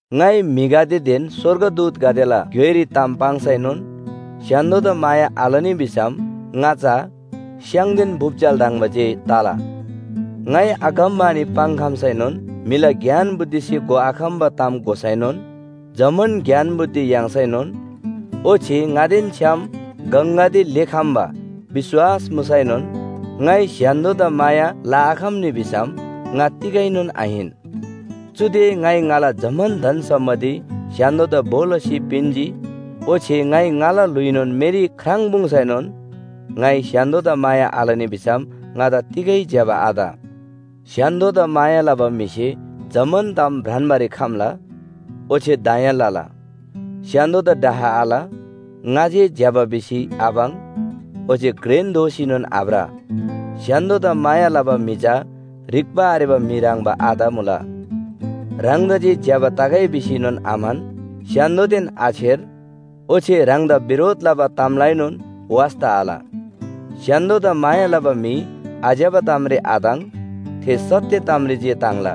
ङाइ म्‍हिगदेदेन स्‍वर्गदूतगदेला ग्‍योइरी ताम पाङ्सैनोन स्‍य्‍हान्‍दोदा माया आलनी भिसम ङा चा स्‍याङदेन बुप्‍जेल ह्रङ्‌बा जे तला। ङाइ अगमवाणी पाङ्‌खम्‍सैनोन म्‍हिला ज्ञान बुद्धिसे घोआखम्‍बा ताम घोसैनोन, जम्‍मान ज्ञान बुद्धि याङ्‌सैनोन, ओच्‍छे ङादेन छ्‌याम गङगदे लेःखम्‍बा विश्‍वास मुसैनोन ङाइ स्‍य्‍हान्‍दोदा माया लआखम्‍नी भिसम ङा तिगैनोन आहिन। चुदे ङाइ ङाला जम्‍मान धन सम्‍पत्ति स्‍य्‍हान्‍दोदा भो लसी पिन्‍जी, ओच्‍छे ङाइ ङाला ल्‍हुइनोन मेरी ख्राङ्‌पुङ्‌सैनोन ङाइ स्‍य्‍हान्‍दोदा माया आलनी भिसम ङादा तिगै ज्‍यबा आत। स्‍य्‍हान्‍दोदा माया लबा म्‍हिसे जम्‍मान ताम भ्रान्‍बारी खम्‍ला ओच्‍छे दया लला। स्‍य्‍हान्‍दोदा डाह आल, ङा जे ज्‍यबा भिसी आपाङ् ओच्‍छे घ्रेन दोसीनोन आभ्र। स्‍य्‍हान्‍दोदा माया लबा म्‍हि चा ह्रिक्‍बा आरेबा म्‍हि ह्रङ्‌बा आत मुला, ह्राङदा जे ज्‍यबा तगै भिसीएनोन आम्‍हन, स्‍य्‍हान्‍दोदेन आछेर, ओच्‍छे ह्राङदा बिरोध लबा तामलाएनोन वास्‍ता आल। स्‍य्‍हान्‍दोदा माया लबा म्‍हि आज्‍यबा तामरी आताङ्, थे सत्‍य तामरी जे ताङ्ला।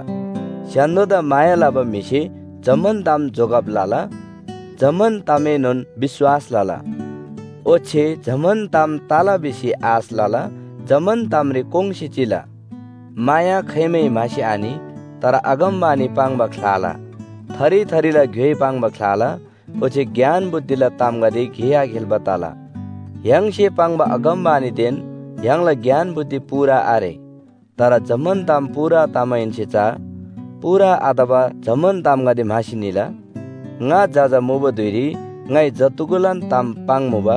स्‍य्‍हान्‍दोदा माया लबा म्‍हिसे जम्‍मान ताम जोगब लला, जम्‍मान तामएनोन विश्‍वास लला, ओच्‍छे जम्‍मान ताम तला भिसी आश लला, जम्‍मान तामरी कोङ्‌सी चिला। माया खाइमै म्‍हासी आनि। तर अगमवाणी पाङ्बा ख्‍लाला, थरी थरीला ग्‍योइ पाङ्बा ख्‍लाला, ओच्‍छे ज्ञान बुद्धिला तामगदे गे आखेल्‍बा तला। य्‍हाङसे पाङ्बा अगमवाणीदेन य्‍हाङला ज्ञान बुद्धि पूरा आरे। तर जम्‍मान ताम पूरा तमाहेन्‍से चा पूरा आतबा जम्‍मान तामगदे म्‍हासी निला। ङा जजा मुबा धुइरी ङाइ जत्‍धुगुलान ताम पाङ्मुबा,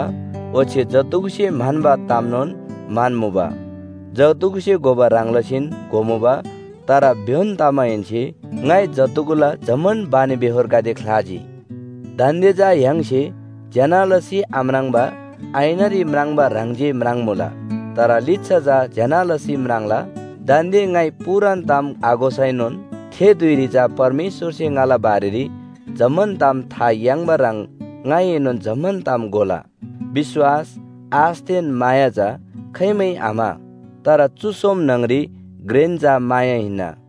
ओच्‍छे जत्‍धुगुसे म्‍हन्‍बा तामनोन म्‍हन्‍मुबा, जत्‍धुगुसे घोबा ह्रङ् लसीन घोमुबा। तर भ्‍योन तमाहेन्‍से ङाइ जत्‍धुगुला जम्‍मान बानीबेहोरगदे ख्‍लाजी। दान्‍दे चा य्‍हाङसे ज्‍यना लसी आम्राङ्बा ऐनारी म्राङ्बा ह्रङ् जे म्राङ्‌मुला, तर लिच्‍छा चा ज्‍यना लसी म्राङ्ला। दान्‍दे ङाइ पूरान ताम आघोसैनोन थे धुइरी चा परमेश्‍वरसे ङाला बारेरी जम्‍मान ताम था याङ्बा ह्रङ् ङाइएनोन जम्‍मान ताम घोला। विश्‍वास, आशदेन माया चा खाइमै आम्‍हा। तर चु सोम न्‍हङरी घ्रेन चा माया हिन्‍ना।